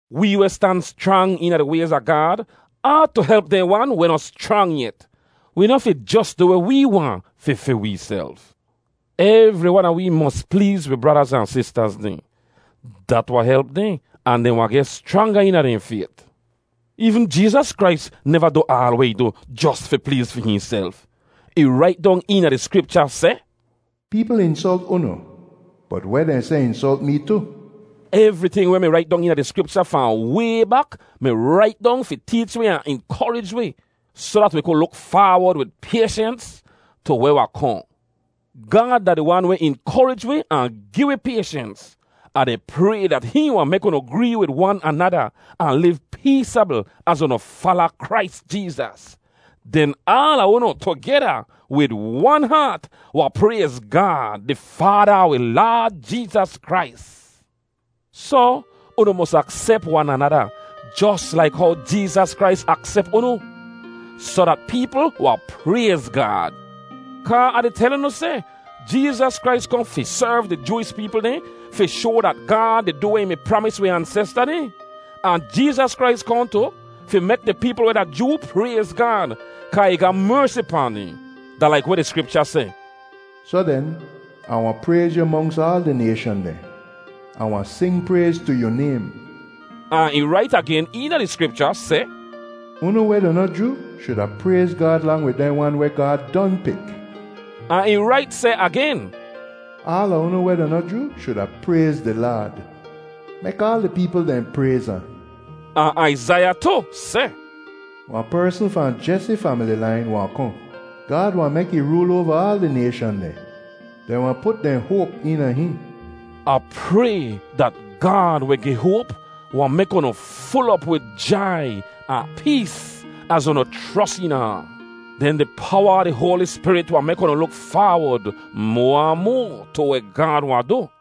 Wee weh stan schrang eena di wayz a Gaad aatu help dehn wan weh noh schrang yet. Wi noh fi jos du weh wee waahn fi fi weeself. Evri wan a wee mos pleez wi bradaz ahn sistaz dehn. Dat wahn help dehn, ahn dehn wahn geh schranga eena dehn fayt. Eevn Jeezas Krais neva du aal weh ih du jos fi pleez fi hihnself. Ih rait dong eena di Skripcha seh, “Peepl insolt unu, bot weh dehn seh insolt mee tu.” Evriting weh mi rait dong eena di Skripcha fahn way bak mi rait dong fi teech wi ahn inkorij wi, soh dat wi ku luk faawod wid payshens tu weh wahn kohn. Gaad da di wan weh inkorij wi ahn gi wi payshens. Ah di pray dat hihn wahn mek unu gree wid wan anada ahn liv peesabl az unu fala Krais Jeezas. Den aala unu tugeda, wid wan haat, wahn prayz Gaad, di Faada a wi Laad Jeezas Krais. Soh, unu mos aksep wan anada, jos laik how Jeezas Krais aksep unu, soh dat peepl wahn prayz Gaad. Kaa Ah di tel unu seh, Jeezas Krais kohn fi serv di Jooish peepl dehn fi shoa dat Gaad di du weh ih mi pramis wi ansesta dehn. Ahn Jeezas Krais kohn tu, fi mek di peepl weh da Joo prayz Gaad, kaa ih ga mersi pahn dehn. Da laik weh di Skripcha seh, “Soh den, Ah wahn prayz yu monks aal di nayshan dehn. Ah wahn sing prayz tu yu naym.” Ahn ih rait agen eena di Skripcha seh, “Unu weh da noh Joo shuda prayz Gaad lang wid dehn wan weh Gaad don pik.” Ahn ih rait seh agen, “Aala unu weh da noh Joo shuda prayz di Laad. Mek aal di peepl dehn prayz ahn.” Ahn Aizaiya tu seh, “Wahn persn fahn Jesi famili lain wahn kohn. Gaad wahn mek ih rool oava aal di nayshan dehn; dehn wahn put dehn hoap eena hihn.” Ah pray dat Gaad weh gi hoap wahn mek unu ful op wid jai ahn pees az unu chros eena ahn. Den di powa a di Hoali Spirit wahn mek unu luk faawod moa ahn moa tu weh Gaad wahn du.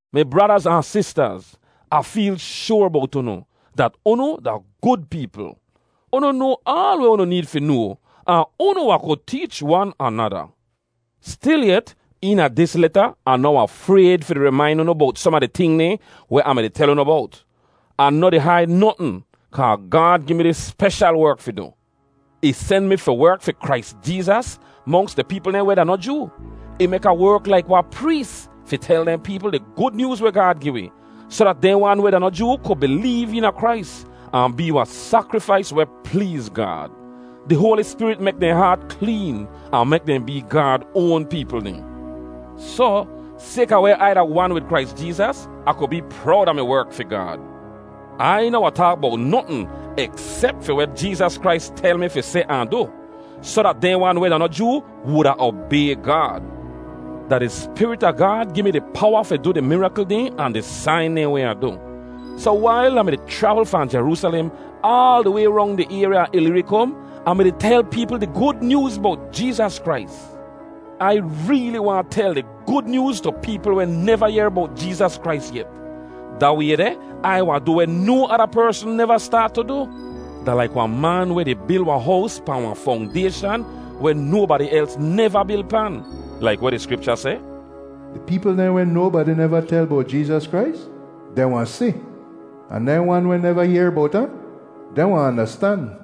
Mi bradaz ahn sistaz. Ah feel shoar bowt unu, dat unu da gud peepl. Unu noa aal weh unu need fi noa, ahn unu wahn ku teech wan anada. Stilyet, eena dis leta Ah noh wahn frayd fi di rimain unu bowt som a di ting dehn weh Ah mi-di tel unu bowt. Ah noh di haid notn, kaa Gaad gi mi dis speshal werk fi du. Ih sen mi fi werk fi Krais Jeezas monks di peepl dehn weh da noh Joo. Ih mek Ah werk laik wahn prees fi tel dehn peepl di Gud Nyooz weh Gaad gi wi, soh dat dehn wan weh da noh Joo ku bileev eena Krais, ahn bee wahn sakrifais weh pleez Gaad. Di Hoali Spirit mek dehn haat kleen, ahn mek dehn bee Gaad oan peepl dehn. Soh, sayka weh Ai da wan wid Krais Jeezas, Ah ku bee prowd a mi werk fi Gaad. Ai noh wahn taak bowt notn eksep fi weh Jeezas Krais tel mi fi seh ahn du, soh dat dehn wan weh da noh Joo wuda obay Gaad. Da di Spirit a Gaad gi mi di powa fi du di mirakl dehn ahn di sain dehn weh Ah du. Soh wail Ah mi-di chravl fahn Jeroosalem aal di way rong di ayrya a Ilirikom, Ah mi-di tel peepl di Gud Nyooz bowt Jeezas Krais. Ai reeli waahn tel di Gud Nyooz tu peepl weh neva yehr bowt Jeezas Krais yet. Da way deh, Ai wahn du weh no ada persn neva staat tu du. Da laik wahn man weh di bil wahn hows pahn wahn fongdayshan weh nobadi els neva bil pan: Laik weh di Skripcha seh, “Di peepl dehn weh nobadi neva tel bowt Jeezas Krais, dehn wahn si. Ahn dehn wan weh neva yehr bowt ahn, dehn wahn andastan.”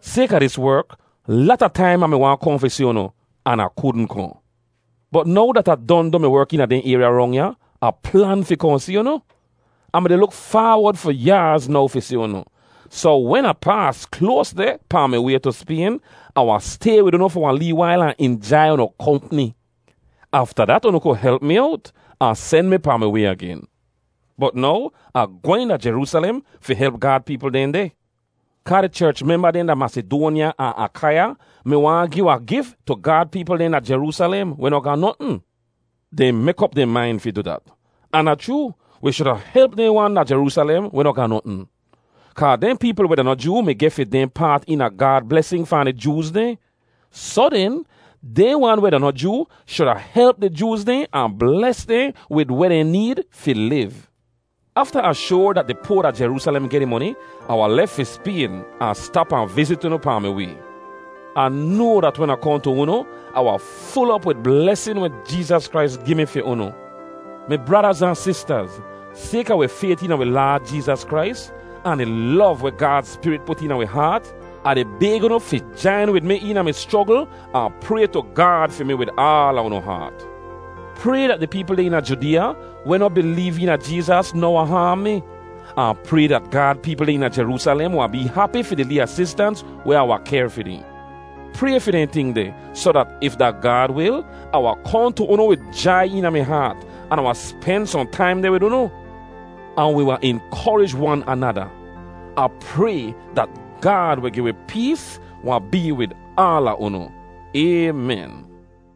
Sayka dis werk, lata taim Ah mi waahn kohn fi si unu, an Ah kudn kohn. Bot now dat Ah don du mi werk eena dehn ayrya rong ya, Ah plan fi kohn si unu. Ah mi-di luk faawod fi yaaz now fi si unu, soh wen Ah paas kloas deh pahn mi way tu Spayn, Ah wahn stay wid unu fi wahn lee wail ahn injai unu kompni. Afta dat unu ku help mi owt ahn sen mi pahn mi way agen. Bot now Ah gwehn da Jeroosalem fi help Gaad peepl dehn deh. Kaa di cherch memba dehn da Masidoanya ahn Akaiya mi waahn gi wahn gif tu Gaad peepl dehn da Jeroosalem, weh noh ga notn. Dehn mek op dehn main fi du dat. Ahn da chroo, wi shuda help dehn wan da Jeroosalem weh noh ga notn. Kaa dehn peepl weh da noh Joo mi geh fi dehn paat eena Gaad blesin fahn di Jooz dehn. Soh den, dehn wan weh da noh Joo shuda help di Jooz dehn ahn bles dehn wid weh dehn need fi liv. Afta Ah shoar dat di poa da Jeroosalem geh di moni, Ah wahn lef fi Spayn ahn stap ahn vizit unu pahn mi way. Ah noa dat wen Ah kohn tu unu, Ah wahn ful op wid blesin weh Jeezas Krais gi mi fi unu. Mi bradaz ahn sistaz, sayka wi fayt eena wi Laad Jeezas Krais, ahn di lov weh Gaad Spirit put eena wi haat, Ah di bayg unu fi jain wid mi eena mi schrogl ahn pray tu Gaad fi mi wid aala unu haat. Pray dat di peepl dehn eena Judeeya weh noh bileev eena Jeezas noh wahn haam mi, ahn pray dat Gaad peepl dehn eena Jeroosalem wahn bee hapi fi di lee asistans weh Ah wahn kehr fi dehn. Pray fi dehn ting deh soh dat, if da Gaad wil, Ah wahn kohn tu unu wid jai eena mi haat, an Ah wahn spen sohn taim deh wid unu, ahn wi wahn inkorij wan anada. Ah pray dat Gaad weh gi wi pees wahn bee wid aala unu. Aymen.